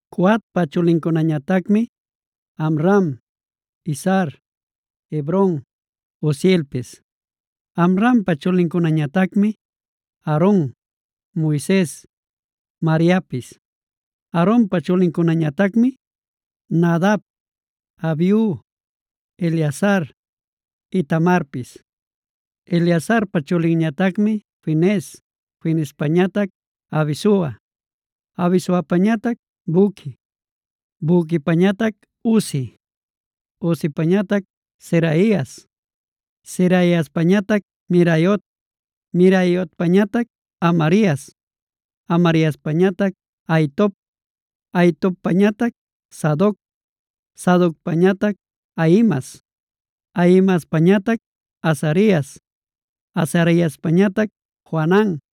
Coatpa chulincunañatacmi: Amram, Izhar, Hebron, Uzielpis. Amrampa chulincunañatacmi: Aaron, Moises, Mariapis.a Aaronpa chulincunañatacmi: Nadab, Abiu, Eleazar, Itamarpis. Eleazarpa chulinñatacmi Finees, Fineespañatac Abisua, Abisuapañatac Buqui, Buquipañatac Uzi, Uzipañatac Zeraias, Zeraiaspañatac Meraiot, Meraiotpañatac Amarias, Amariaspañatac Ahitob, Ahitobpañatac Sadoc, Sadocpañatac Ahimaas, Ahimaaspañatac Azarias, Azariaspañatac Johanan,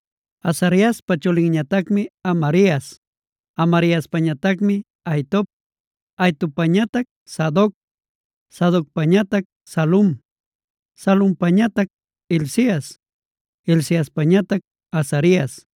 Azariaspa chulinñatacmi Amarias, Amariaspañatacmi Ahitob, Ahitobpañatac Sadoc, Sadocpañatac Salum, Salumpañatac Hilcias, Hilciaspañatac Azarias,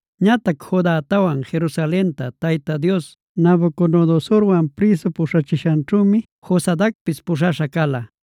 Ñatac Judatawan Jerusalenta Tayta Dios Nabucodonosorwan prïsu puśhachishanćhümi Josadacpis puśhaśha cala.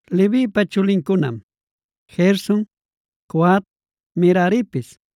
Levipa chulincunam: Gerson, Coat, Meraripis.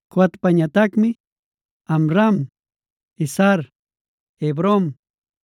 Coatpañatacmi: Amram, Izhar, Hebron,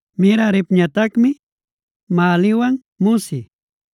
Meraripñatacmi Mahliwan Musi.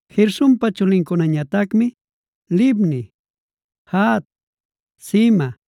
Gersonpa chulincunañatacmi: Libni, Jahat, Zima,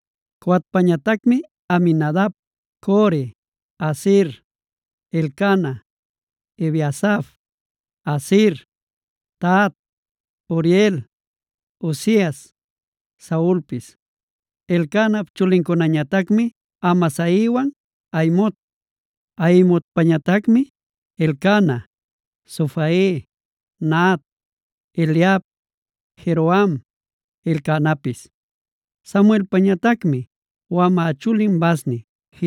Coatpañatacmi: Aminadab, Core, Asir, Elcana, Ebiasaf, Asir, Tahat, Uriel, Uzias, Saulpis. Elcanap chulincunañatacmi Amasaiwan Ahimot. Ahimotpañatacmi: Elcana, Zofai, Nahat, Eliab, Jeroham, Elcanapis. Samuelpañatacmi: wamä chulin Vasni,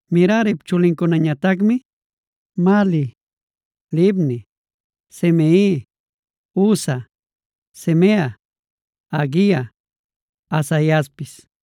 Merarip chulincunañatacmi: Mahli, Libni, Simei, Uza, Simea, Haguia, Asaiaspis.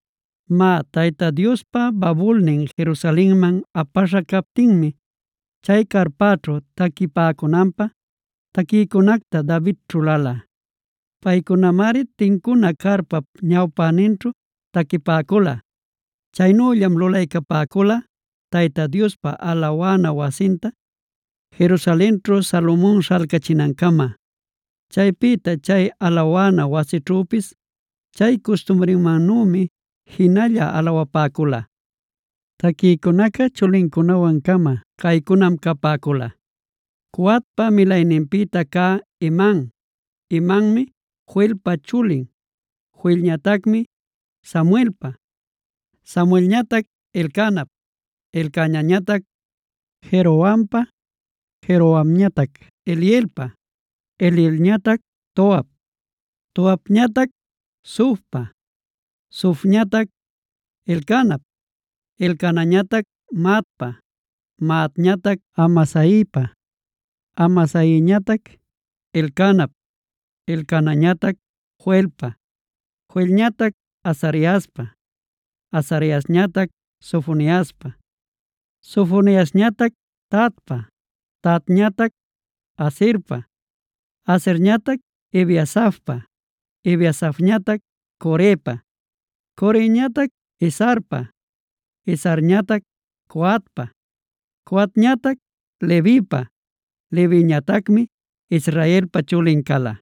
Má, Tayta Diospa babulnin Jerusalenman apaśha captinmi chay carpaćhu taquipäcunanpä taquïcunacta David ćhulala. Paycunamari tincuna carpap ñawpäninćhu taquipäcula. Chaynüllam lulaycapäcula Tayta Diospa alawana wasinta Jerusalenćhu Salomon śhalcachinancama. Chaypïta chay alawana wasićhüpis chay custumrinmannümi jinalla alawapäcula. Taquïcunaca chulincunawan-cama caycunam capäcula: Coatpa milayninpïta cä Heman. Hemanmi Joelpa chulin, Joelñatacmi Samuelpa, Samuelñatac Elcanap, Elcanañatac Jerohampa, Jerohamñatac Elielpa, Elielñatac Toap, Toapñatac Zufpa, Zufñatac Elcanap, Elcanañatac Mahatpa, Mahatñatac Amasaipa, Amasaiñatac Elcanap, Elcanañatac Joelpa, Joelñatac Azariaspa, Azariañatac Sofoniaspa, Sofoniasñatac Tahatpa, Tahatñatac Asirpa, Asirñatac Ebiasafpa, Ebiasafñatac Corepa, Coreñatac Izharpa, Izharñatac Coatpa, Coatñatac Levipa, Leviñatacmi Israelpa chulin cala.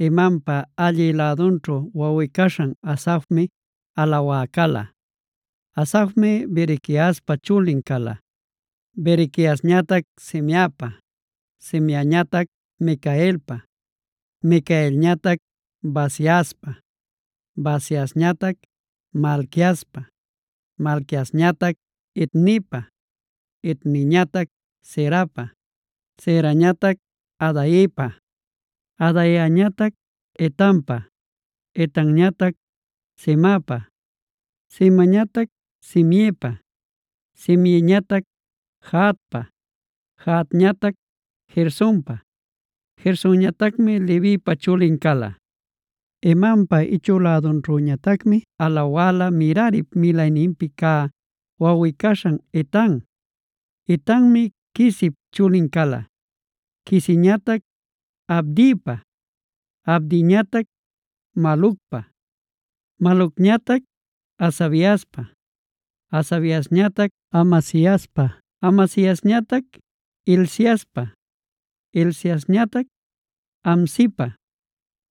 Hemanpa allï lädunćhu wawꞌi-caśhan Asafmi alawä cala. Asafmi Berequiaspa chulin cala, Berequiasñatac Simeapa, Simeañatac Micaelpa, Micaelñatac Baasiaspa, Baasiasñatac Malquiaspa, Malquiasñatac Etnipa, Etniñatac Zerapa, Zerañatac Adaiapa, Adaiañatac Etanpa, Etanñatac Zimapa, Zimañatac Simeipa, Simeiñatac Jahatpa, Jahatñatac Gersonpa, Gersonñatacmi Levipa chulin cala. Hemanpa ichü lädunćhüñatacmi alawala Merarip milayninpi cä wawꞌi-caśhan Etan. Etanmi Quisip chulin cala, Quisiñatac Abdipa, Abdiñatac Malucpa, Malucñatac Hasabiaspa, Hasabiasñatac Amasiaspa, Amasiasñatac Hilciaspa, Hilciasñatac Amsipa,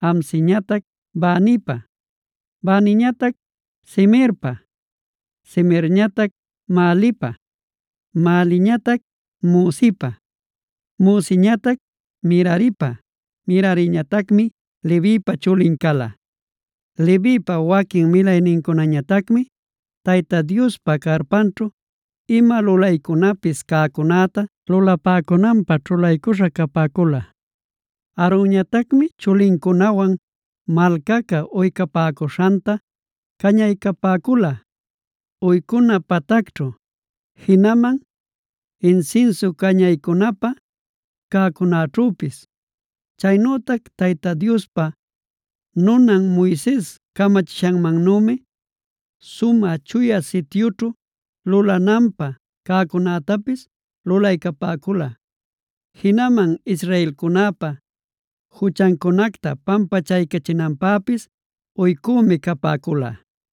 Amsiñatac Banipa, Baniñatac Semerpa, Semerñatac Mahlipa, Mahliñatac Musipa, Musiñatac Meraripa, Merariñatacmi Levipa chulin cala. Levipa waquin milaynincunañatacmi Tayta Diospa carpanćhu ima lulaycunapis cäcunäta lulapäcunanpä ćhulaśha capäcula. Aaronñatacmi chulincunawan malcaca uycapäcuśhanta cañaycapäcula uycuna patacćhu, jinaman insinsu cañaycunapä cäcunäćhüpis. Chaynütac Tayta Diospa nunan Moises camachishanmannümi Sumä Chuya Sityućhu lulananpä cäcunätapis lulaycapäcula. Jinaman israelcunäpa juchancunacta pampachaycachinanpäpis uycümi capäcula.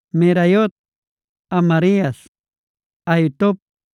Meraiot, Amarias, Ahitob,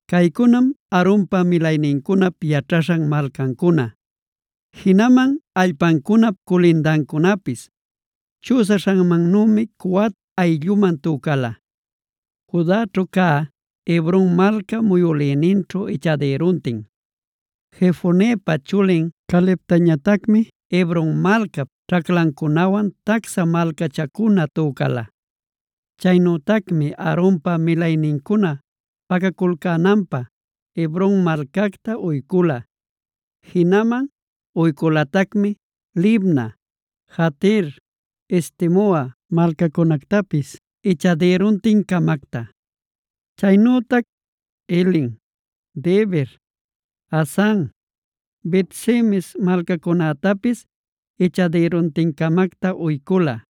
Caycunam Aaronpa milaynincunap yaćhaśhan malcancuna, jinaman allpancunap culindancunapis. Chüsaśhanmannümi Coat aylluman tücala: Judaćhu cä Hebron malca muyülïninćhu ichadïruntin. Jefonepa chulin Calebtañatacmi Hebron malcap ćhaclancunawan tacsha malcachancuna tücala. Chaynütacmi Aaronpa milaynincuna pacaculcänanpä Hebron malcacta uycula. Jinaman uyculatacmi Libna, Jatir, Estemoa malcacunactapis ichadïruntin-camacta. Chaynütac Hilen, Debir, Asan, Bet-semes malcacunactapis ichadïruntin-camacta uycula.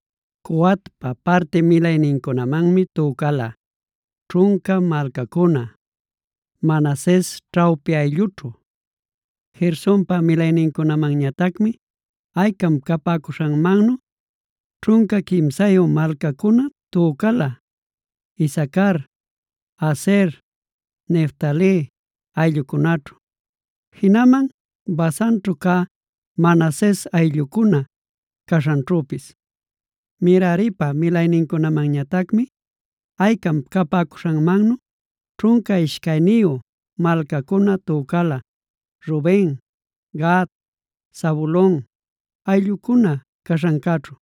Coatpa parti milaynincunamanmi tücala: ćhunca malcacuna, Manases ćhawpi ayllućhu. Gersonpa milaynincunamanñatacmi aycam capäcuśhanmannu ćhunca quimsayu malcacuna tücala Isacar, Aser, Neftali ayllucunaćhu, jinaman Basanćhu cä Manases ayllucuna caśhanćhüpis. Meraripa milaynincunamanñatacmi aycam capäcuśhanmannu ćhunca ishcayniyu malcacuna tücala Ruben, Gad, Zabulon ayllucuna caśhancäćhu.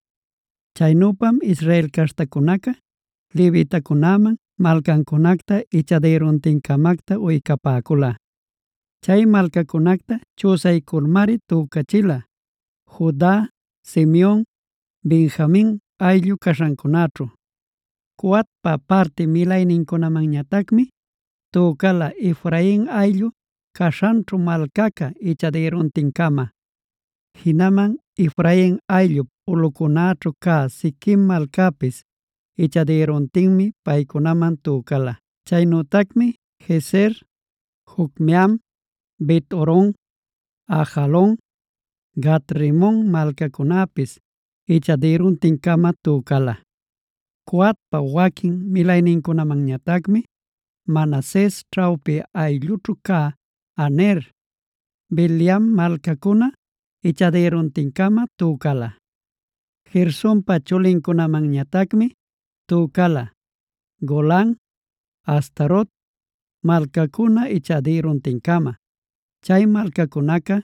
Chaynüpam Israel caśhtacunaca levitacunäman malcacunacta ichadïruntinta-camacta uycapäcula. Chay malcacunacta chüsayculmari tücachila Juda, Simeon, Benjamin ayllu caśhancunaćhu. Coatpa parti milaynincunamanñatacmi tücala, Efrain ayllu caśhanćhu malcaca ichadïruntin-cama. Jinaman Efrain ayllup ulꞌuncunaćhu cä Shiquem malcapis ichadïruntinmi paycunaman tücala. Chaynütacmi Gezer, Jocmeam, Bet-horon, Ajalon, Gat-rimon malcacunapis ichadïruntin-cama tücala. Coatpa waquin milaynincunamanñatacmi Manases ćhawpi ayllućhu cä Aner, Bileam malcacuna ichadïruntinta-cama tücala. Gersonpa chulincunamanñatacmi tücala: Golan, Astarot malcacuna ichadïruntin-cama. Chay malcacunaca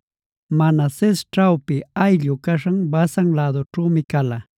Manases ćhawpi ayllu caśhan Basan lädućhümi cala.